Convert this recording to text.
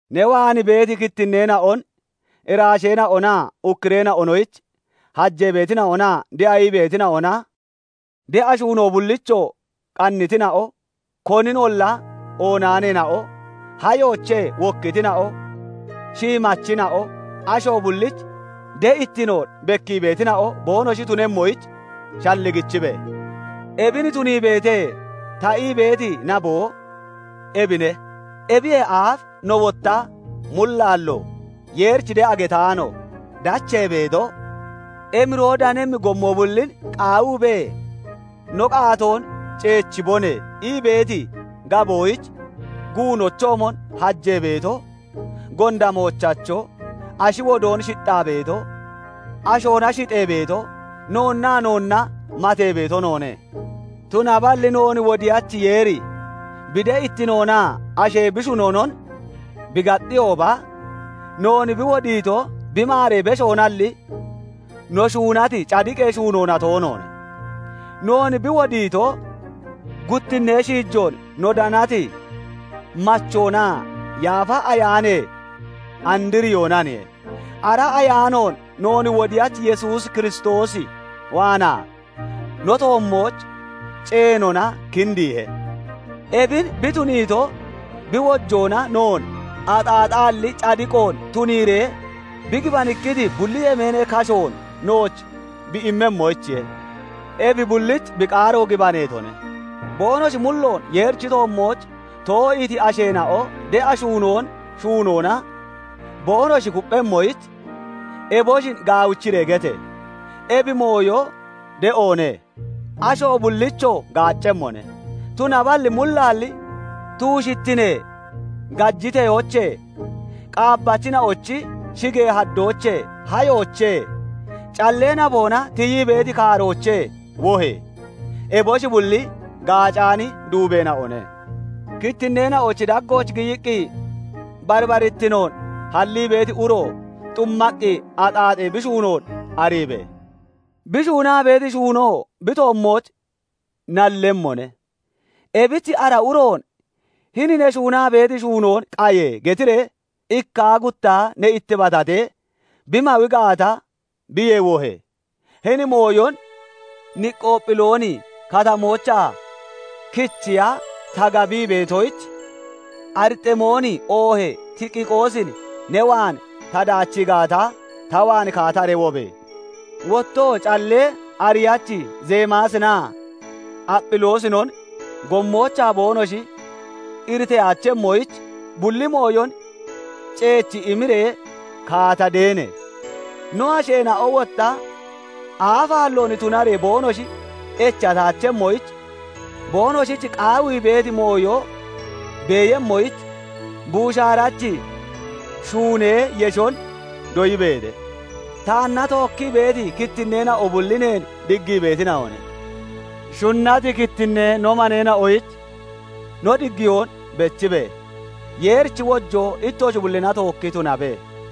Ne waan beeti kittinneena'on, iraasheena'onaa ukkureena'onoyich hajee beetina'onaa de'a ii beetina'ona, de'a shuunoo bullichoo qannitina'o, koninolla oonaaneena'o, hayoochee (naboochee) wokkitina'o, shiimachina'o, asho bullich de'ittinoon bekkii beetina'o boonoshi tunemmoyich shalligichibe! "Ebin tuniibeete" ta ii beeti naboo ebine; ebiyee aaf no wotta mullaallo, Yeerich de'a getaano, dachee beeto, emiroo danemmi gommo bullin qaawiibee, "No qaatoon ceechibone" ii beeti gaboyich guunochoomon hajee beeto, gonda moochacho, ashi wodoon shixxaa beeto, ashoona shixxee beeto, noonnaa noonna matee beeto noone; tunaballi noon Wodiyachi Yeeri bi de'ittinoonaa ashee bi shunonon bi gaxxiyooba, noon bi wodiito bi maaree beshoonalli, no shuunati cadiqee shuunoona toonoone; noon bi wodiito guttinnee shiijoon no danati machoonaa Yaafa Ayaanee andriyoonaniye; ara Ayaanoon noon Wodiyachi Yesuus Kiristoos waanaa no toommooch ceenona kindiihe; ebin bi tuniito, bi wojoona noon axaaxaalli cadiqoon tuniiree bi gibanikkiti bulli yemeenee kashoon nooch bi immemmoyichiye. Ebi bullich bi qaaro gibaneetone; boonoshi mulloon Yeerichi toommooch too'iiti asheena'o de'a shuunoon shuunoona boonoshi kupphemmoyich, eboshin gaawichiree gete! Ebi mooyo de'oone; asho bullichoo gaaccemmone. Tunaballi mullaalli tuushittinee gajiteyoochee, qaabbachina'ochi shigee haddoochee, hayoochee (naboochee), callee naboona tiyii beeti kaaroochee wohe! Eboshi bulli gaacaani duubeena'one. Kittinneena'ochi daggooch giyiqqi barbarittinoon hallii beeti uro xummaqqi axaaxee bi shuunoon ariibe! Bi shuunaa beeti shuunoo bi toommooch nallemmone. Ebich ara uroon "Hini ne shuunaa beeti shuunoon qaye!" getiree ikkaa guttaa ne ittibatatee bi mawi gaata, biyee wohe! Hini yooyon Niqoophilooni Katamoochaa kichiya ta gabii beetoyich, Ariximoonin oohee Tikiqoosin ne waan ta daachii gaata, ta waan kaataree wobe! Wottoo callee ariyachi Zemaasinaa Aphiloosinon gommoochaa boonoshi iriteyaachemmoyich, bulli mooyon ceechi imiree kaata deene! No asheena'o wotta aafaalloon tunaree boonoshi echataachemmoyich, boonoshich qaawii beeti mooyo beeyemmoyich buushaarachi shuunee yeshon doyibeete. Taanna tookkii beeti kittinneena'o bulli neen diggii beetina'one. Shunnati kittinnee no maneena'oyich no diggiyoon bechibe! Yeerichi wojoo ittoshi bullina tookki tunabe.